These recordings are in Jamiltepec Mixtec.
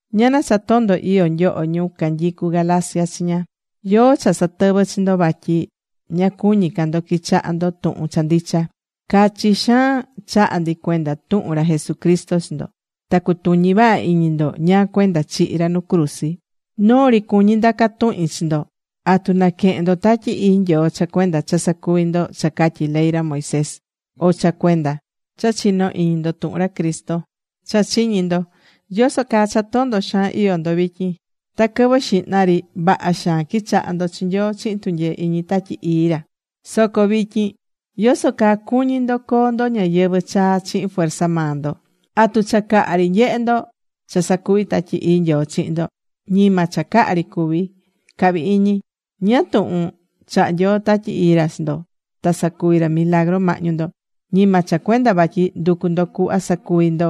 ¡Ñana cha tondo iyó nyoho ñu canyicu Galacia chiña! ¿Yóó cha satɨvɨ́ chi ndo vatyi ña cuñí ca ndo quichaha ndo tuhun cha ndicha? Cachi xaan chaha̱ ndi cuenda tuhun ra Jesucristo chi ndo. Ta cutuñi̱ vaha iñi ndo ñáá cuenda chihi̱ ra nu cruzi. Noo ri cuñí ndaca tuhin chi ndo. ¿Atu naquehe̱n ndo Tatyi Ii Nyoo cha cuenda cha sacuví ndo cha catyí ley ra Moisés, o cha cuenda cha chinó iñi ndo tuhun ra Cristo cha chiñi ndo? ¿Yoso caa cha tondo xaan iyó ndo vityin? Ta quɨvɨ xihna ri vaha xaan quichaha̱ ndo chi Nyoo chihin tunyee iñi Tatyi Ii ra. Soco vityin, ¿yoso caa cuñí ndo coo ndo ñayɨvɨ̱ chaa chihin fuerza maa ndo? ¿Atu cha caha ri nyehe̱ ndo cha sacuvi̱ Tatyi Ii Nyoo chihin ndo? Ñima cha caha ri cuví, cahví iñi. ¿Ñáá tuhun chahá Nyoo Tatyi Ii ra chi ndo, ta sacuví ra milagru mahñu ndo? Ñima cha cuenda vatyi nducu̱ ndo cuhva sacuvi ndo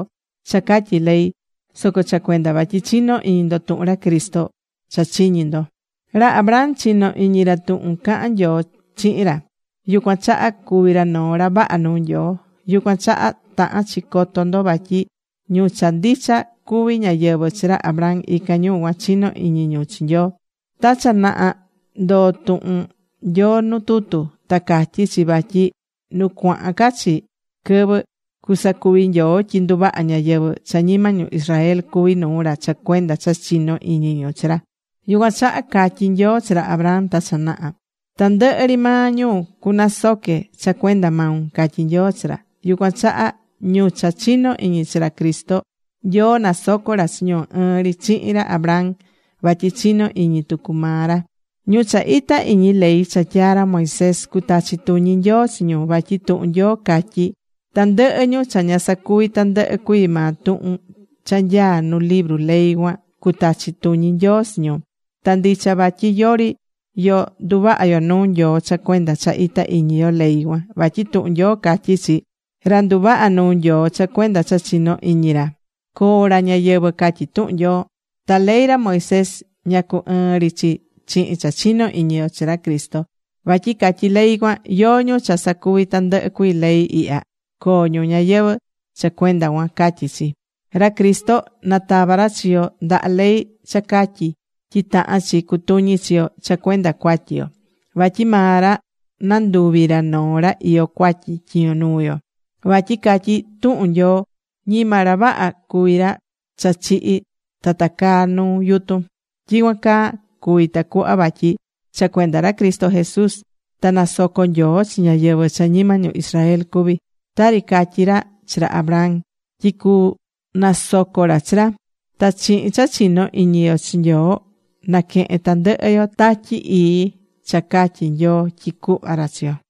cha catyí ley, soco cha cuenda vatyi chinó iñi ndo tuhun ra Cristo cha chiñí ndo. Ra Abraham, chino̱ iñi ra tuhun caha̱n Nyoo chihin ra, yucuan chaha cuví ra noo ra vaha nuu Nyoo. Yucuan chaha tahán chi coto ndo vatyi ñu cha ndicha cuví ñáyɨvɨ chi ra Abraham, ican ñu cuan chinó iñi ñu chi Nyoo. Ta cha naha ndoo̱ tuhun Nyoo nu tutu. Ta catyí chi vatyi nu cuahán ca chi quɨvɨ, cusacuvi Nyoo tyi nduvaha ñáyɨvɨ cha ñima ñu Israel cuví nuu ra cha cuenda cha chinó iñi ñu chi ra. Yucuan chaha catyi̱ Nyoo chi ra Abraham ta cha naha: “Tandɨhɨ ri maa ñu cunasoque cha cuenda maun”, catyi̱ Nyoo chi ra. Yucuan chaha ñu cha chinó iñi chi ra Cristo, Nyoo nasocó ra chi ñu ɨɨn ri chihin ra Abraham, vatyi chinó iñi tucu maa ra. Ñu cha itá iñi ley cha tyaa ra Moisés, cutachi tuñi Nyoo chi ñu. Vatyi tuhun Nyoo catyí. “Tandɨhɨ ñu cha ña sacuví tandɨhɨ cuii maa tuhun cha nyaá nu libru ley cuan, cutachi tuñi Nyoo chi ñu.” Ta ndicha vatyi yori yo nduvaha yo nuu Nyoo cha cuenda cha itá iñi yo ley cuan. Vatyi tuhun Nyoo catyí chi: “Ra nduvahá nuu Nyoo cha cuenda cha chinó iñi ra, coo ra ñayɨvɨ̱”, catyí tuhun Nyoo. Ta ley ra Moisés ña cu ɨɨ́n ri chi chihin cha chinó iñi yo chi ra Cristo. Vatyi catyí ley cuan: “Yóó ñu cha sacuvi tandɨhɨ cuii ley ihya, coo ñu ñayɨvɨ̱ cha cuenda cuan”, catyí chi. Ra Cristo natava̱ ra chi yo ndaha ley cha catyí tyi tahán chi cutuñi chi yo cha cuenda cuatyi yo. Vatyi maa ra nanduvi ra noo ra iyó cuatyi tyiño nuu yo. Vatyi catyí tuhun Nyoo: “Ñima ra vaha cuví ra cha chihi̱ ta tacaá nu yutun.” Tyicuan caa cuvi̱ tacuhva vatyi cha cuenda ra Cristo Jesús ta nasocó Nyoo chi ñáyɨvɨ cha ñima ñu Israel cuví, tari catyi̱ ra chi ra Abraham tyi cunasoco ra chi ra. Ta chihin cha chinó iñi yo chi Nyoo, naquehén tandɨhɨ yo Tatyi Ii cha catyi̱ Nyoo tyi cuhva ra chi yo.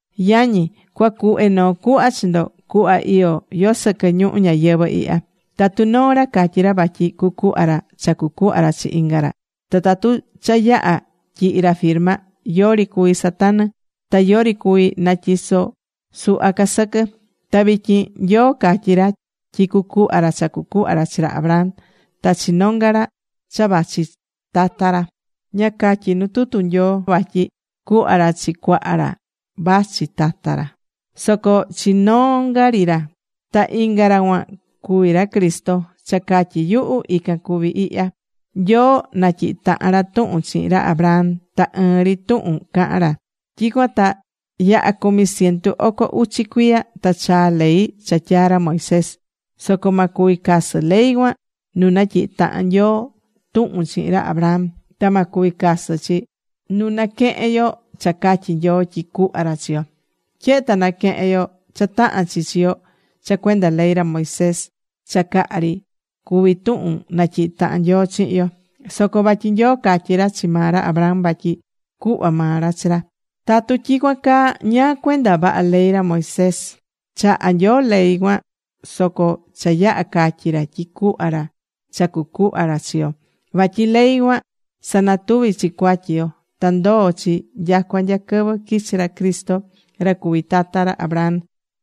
Yañi, cuacuhve noo cuhva chi ndo, cuhva iyó yo sɨquɨ ñuhu ñayɨvɨ̱ ihya. Tatu noo ra catyí ra vatyi cucuhva ra cha cucuhva ra chi inga ra. Ta tatu cha yaha̱ tyihi̱ ra firma, yori cuví satanɨ. Ta yori cuví natyiso suhva ca sɨquɨ. Ta vityin, Nyoo catyi̱ ra tyi cucuhva ra cha cucuhva ra chi ra Abraham ta chi nonga ra cha vachi tata ra. Ña catyí nu tutu Nyoo vatyi cuhva ra chi cuaha ra vachi tata ra, soco chi nonga ri ra. Ta ican ra cuan cuví ra Cristo. Cha catyí yuhu, ican cuví ihya: Nyoo natyihi tahan ra tuhun chihin ra Abraham. Ta ɨɨn ri tuhun cahán ra. Tyicuan ta yaha cumi ciento oco uchi cuiya ta chaa̱ ley cha tyaa ra Moisés. Soco ma cuvi casɨ ley cuan nu natyihi̱ tahan Nyoo tuhun chihin ra Abraham. Ta ma cuvi casɨ chi nu naquehen yo cha catyi̱ Nyoo tyi cuhva ra chi yo. Tyehe ta naquehén yo cha tahán chi chi yo cha cuenda ley ra Moisés, cha caha ri cuvi tuhun natyihi tahan Nyoo chihin yo. Soco vatyi Nyoo catyi̱ ra chi maa ra Abraham vatyi cuhva maa ra chi ra. Tatu tyicuan caa, ¿ñáá cuenda vaha ley ra Moisés? Chaha̱ Nyoo ley cuan soco cha yaha̱ catyi̱ ra tyi cuhva ra cha cucuhva ra chi yo. Vatyi ley cuan sanatuví chi cuatyi yo. Ta ndoo̱ chi nyacua nya quɨvɨ quichi̱ ra Cristo ra cuví tata ra Abraham.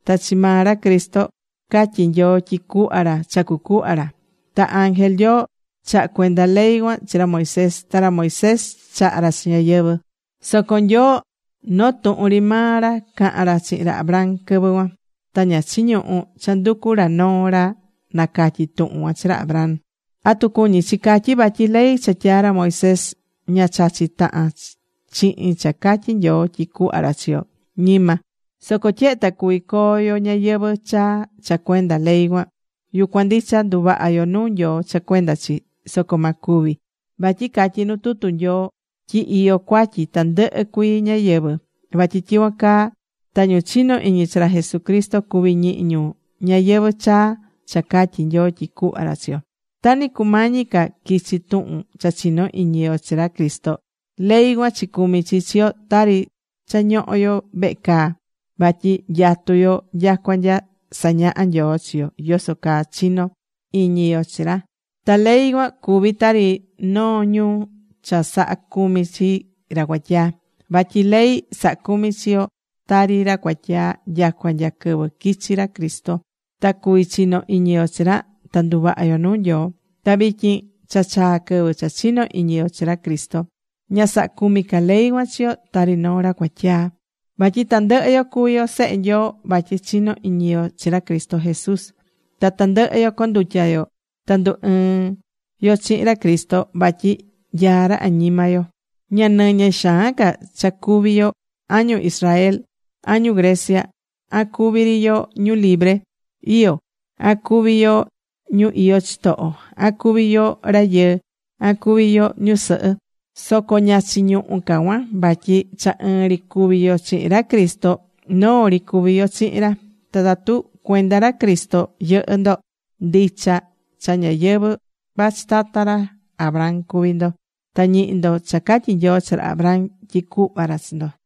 Ta chi maa ra Cristo catyi Nyoo tyi cuhva ra cha cucuhva ra. Ta ángel Nyoo chaha̱ cuenda ley cuan chi ra Moisés. Ta ra Moisés chaha̱ ra chi ñáyɨvɨ. Soco Nyoo noo tuhun ri maa ra caha̱n ra chihin ra Abraham quɨvɨ cuan. Ta ña chiñuhú cha nducu ra noo ra nacatyi tuhun cuan chi ra Abraham. ¿Atu cuñí chi catyi vatyi ley cha tyaa̱ ra Moisés ña chachí tahan chihin cha catyi Nyoo tyi cuhva ra chi yo? Ñima. Soco tyehe ta cuví coo yo ñayɨvɨ̱ chaa cha cuenda ley cuan, yucuan ndicha nduvaha yo nuu Nyoo cha cuenda chi. Soco ma cuvi. Vatyi catyí nu tutu Nyoo tyi iyó cuatyi tandɨhɨ cuii ñáyɨvɨ. Vatyi tyicuan caa ta ñu chinó iñi chi ra Jesucristo cuví ñihi ñu ñayɨvɨ̱ chaa cha catyi Nyoo tyi cuhva ra chi yo. Ta ni cumañi ca quichi tuhun cha chinó iñi yo chi ra Cristo, ley cuan chicumi̱ chi chi yo tari cha ñoho̱ yo vehe caa. Vatyi nyatu̱ yo nyacua nya sañaha Nyoo chi yo yoso caa chino iñi yo chi ra. Ta ley cuan cuví tari noo ñu cha sahá cumi chi ra cuatyaa. Vatyi ley saha̱ cumi chi yo tari ra cuatyaa nyacua nya quɨvɨ quichi̱ ra Cristo. Ta cuvi̱ chinó iñi yo chi ra ta nduvaha yo nuu Nyoo. Ta vityin cha chaa̱ quɨvɨ cha chinó iñi yo chi ra Cristo, ña sahá cumi ca ley cuan chi yo tari noo ra cuatyaa. Vatyi tandɨhɨ yo cuví yo sehe Nyoo vatyi chinó iñi yo chi ra Cristo Jesús. Ta tandɨhɨ yo condutya̱ yo ta ndu ɨɨ̱n yo chihin ra Cristo. Vatyi nyaá ra añima yo. Ña nɨñɨ xaan ca cha cuví yo, an ñu Israel, an ñu Grecia, an cuví ri yo ñu libre iyó, an cuví yo ñu iyó chitoho. An cuví yo rayɨɨ, an cuví yo ñusɨhɨ, soco ña chiñuhu ca cuan. Vatyi cha ɨɨn ri cuvi yo chihin ra Cristo, noo ri cuví yo chihin ra. Ta tatu cuenda ra Cristo yɨhɨ́ ndo, ndicha cha ñáyɨvɨ vachi tata ra Abraham cuví ndo. Ta ñihí ndo cha catyi̱ Nyoo chi ra Abraham tyi cuhva ra chi ra.